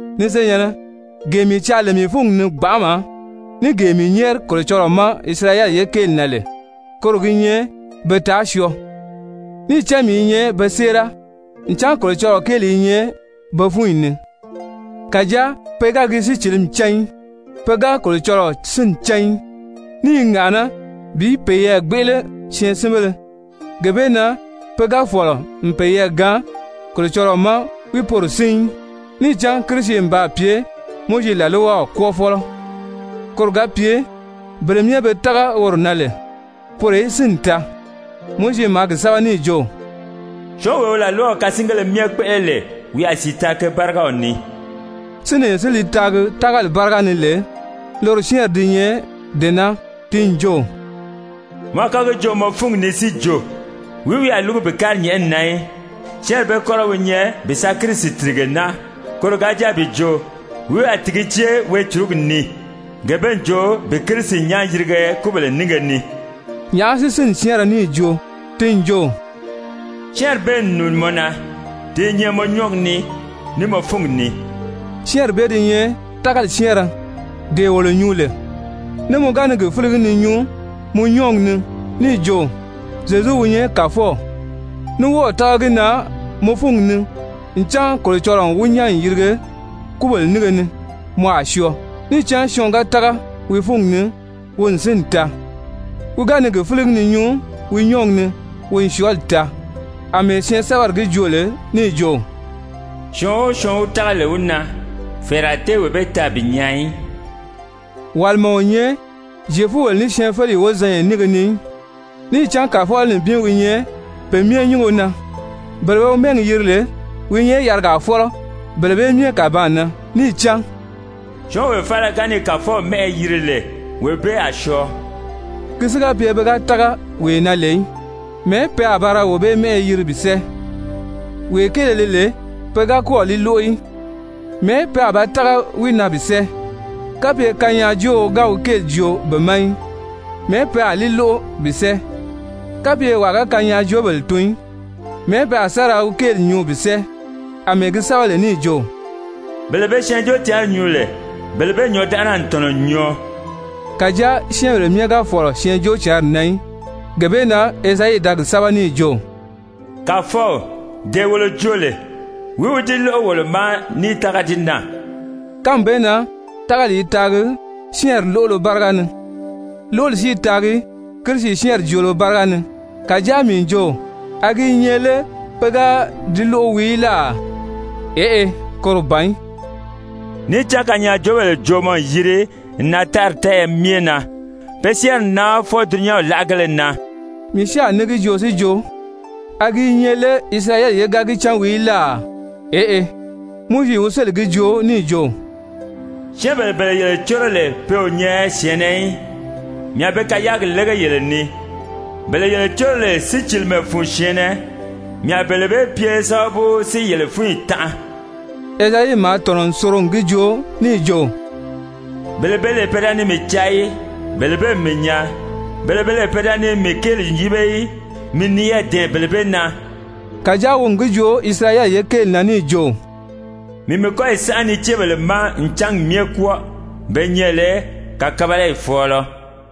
Ni senyɛ̀nnɛ, gee mii caa lè mii fúngi ni gbanʔama, ní gee mii nyɛ́ɛri Kolocɔlɔɔ ma Isirayɛli ye kéeli na lè, koro gi nyɛ be taa syɔɔ. Níì cán mii i nyɛ be séera ncan Kolocɔlɔɔ kéeli i nyɛ be fúnyi ni, kàjáa pe ga gi sícilimi cán í. Pe ga Kolocɔlɔɔ sínni cán í, ní i ŋàʔaná bi peyɛɛ gbéʔele syɛɛnsinbéle, gee bee na pe ga fɔ̀lɔ n peyɛɛ gaan Kolocɔlɔɔ ma wi poro sín í. Níì cán Kirisi n baa pye Mowizi làlwaw kwɔ́ɔfɔlɔ, koro ga pye bele myɛ be tága woro na lè, poro í sínni taa. Mowizi maa gi sɛ́bɛ níì jo: «Syɔ́ɔnwee wi làlwaw kasingéle myɛ kpéʔele lè, wi a sìi taa ke bárigaw ni.» Sínlee si li taagi tágali báriga ni lè, loro syɛ́ɛnri di nyɛ dee naa, ti n jo: «Mɔ a kɔ́ gi joo mɔ fúngi ni si jo, wìí wi a lúgu bi kári nyɛ̀ʔɛni na í?» Syɛ́ɛnri bee kɔ́rɔ wi nyɛ bi sa Kirisi tìrige naa. Koro ga jáa bi jo: «Wìí wi a tìgi jée weecurugi ni?» Gee bee n jo bi Kirisi nyán yirige kúbèle nínge ni. Nyàʔá si sínni syɛ́ɛnrɛ níì joo? Ti n jo: «Syɛ́ɛnri bee n nùuni mɔ na, ti i nyɛ mɔ nyɔ́ɔgi ni, ní mɔ fúngi ni.» Syɛ́ɛnri bee di nyɛ tágali syɛ́ɛnrɛ dee wolo nyuu lè. Ní mɔ ga ni gi fíligi ni nyuu mɔ nyɔ́ɔgi ni níì jo «Zyezu wi nyɛ Kàfɔw,» ní wɔ́ɔ̀ tága gi na mɔ fúngi ni ncan Kolocɔlɔɔ n wi nyán n yirige kúbèle nínge ni, mɔ a syɔɔ. Níì cán syɔɔn ga tága wi fúngi ni, wi n sínni taa, wi ga ni gi fíligi ni nyuu wi nyɔ́ɔgi ni, wi n syɔɔli taa, àmɛɛ syɛɛnsɛbɛri gi joo lè níì jo: «Syɔɔn o syɔɔn wi tága lè wi na, fɛ̀ɛrɛ a tée wee bee taa bi nyaa í.» Wàlima o nyɛ Zyefubèlesyɛɛnfeleyi wozanya nínge ni í, níì cán Kàfɔlɔ nibin wi nyɛ pe myɛ nyúngo na, bele be wi mɛ́ɛgi yiri lè, wi i nyɛ yarigaa fɔ́lɔ bele bee myɛ kàbaan na. Níì cán «Syɔ́ɔnwee faala ga ni Kàfɔw mɛ́ʔɛ yiri lè, wee bee a syɔɔ.» Ki si ga pye pe ga tága wee na lè í, mɛ̀ɛ́ pe a ba ra wee bee mɛ́ʔɛ yiri bi sɛ́ɛ? Wee kéele li lè pe ga kɔ́ɔ̀ li lóʔo í, mɛ̀ɛ́ pe a ba tága wi na bi sɛ́ɛ? Kapye kanyaajooo ga wi kéeli joo be ma í, mɛ̀ɛ́ pe a li lóʔo bi sɛ́ɛ? Kapye wàa ga kanyaajoobèle tun í, mɛ̀ɛ́ pe a sa ra wi kéeli nyuu bi sɛ́ɛ? Amɛɛ gi sɛ́bɛ lè níì jo: «Bele be Syɛɛnjóocǎnri nyuu lè, bele bee nyɔ̌ndanʔana n tɔ̀nɔ n nyɔɔ.» Kàjáa syɛ́ɛnbèle myɛ ga fɔ̀lɔ Syɛɛnjóocǎnri na í. Gee bee na Ezayi da gi sɛ́bɛ níì jo: «Kàfɔw, dee wolo joo lè, wìí wi di lóʔo wolo ma níì tága di na?» Kánmi bee na tágali i taagi syɛ́ɛnri lóʔolo báriga ni, lóʔoli si i taagi Kirisi syɛ́ɛnri joolo báriga ni. Kàjáa mii n jo, a gi i nyɛ lé pe ga di lóʔo wii í láà? Eʔe, koro ban í! «Níì cán kanyaajoobèle joomɔ n yiri n nan tári tɛ́ɛyɛ myɛ na. Pe syɛ́ɛnri n nan fwɔɔ dulunyanw láʔagéle na.» Mii si a ní gi joo si jo, a gi i nyɛ lé Isirayɛli ye ga gi cán wii í láà? Eʔe, Mowizi wi sélì gi joo níì jo: «Syɛ́ɛnbèle bele yele córo lè pe o nyɛ syɛ̀ɛnnɛ í, mii a be kayaagi lége yele ni. Bele yele córo lè sícilimɛ fun syɛ̀ɛnnɛ, mii a bele bee pye sábabu si yele fúnyi tanʔa.» Ezayi maa tɔ̀nɔ n soro n gi joo níì jo: «Bele be lè pe da ni mii caa í, bele bee n mii nyaa, bele be lè pe da ni mii kéeli yíbe í, mii n niyɛɛ dɛ̀ɛn bele bee na.» Kàjáa wi n gi joo Isirayɛli ye kéeli na níì jo: «Mii n mii kɔ́yi sánʔa niceebèle ma n cángi myɛ kwɔ́ɔ, be nyɛ lè kàkabalayi fɔ̀ɔlɔ.»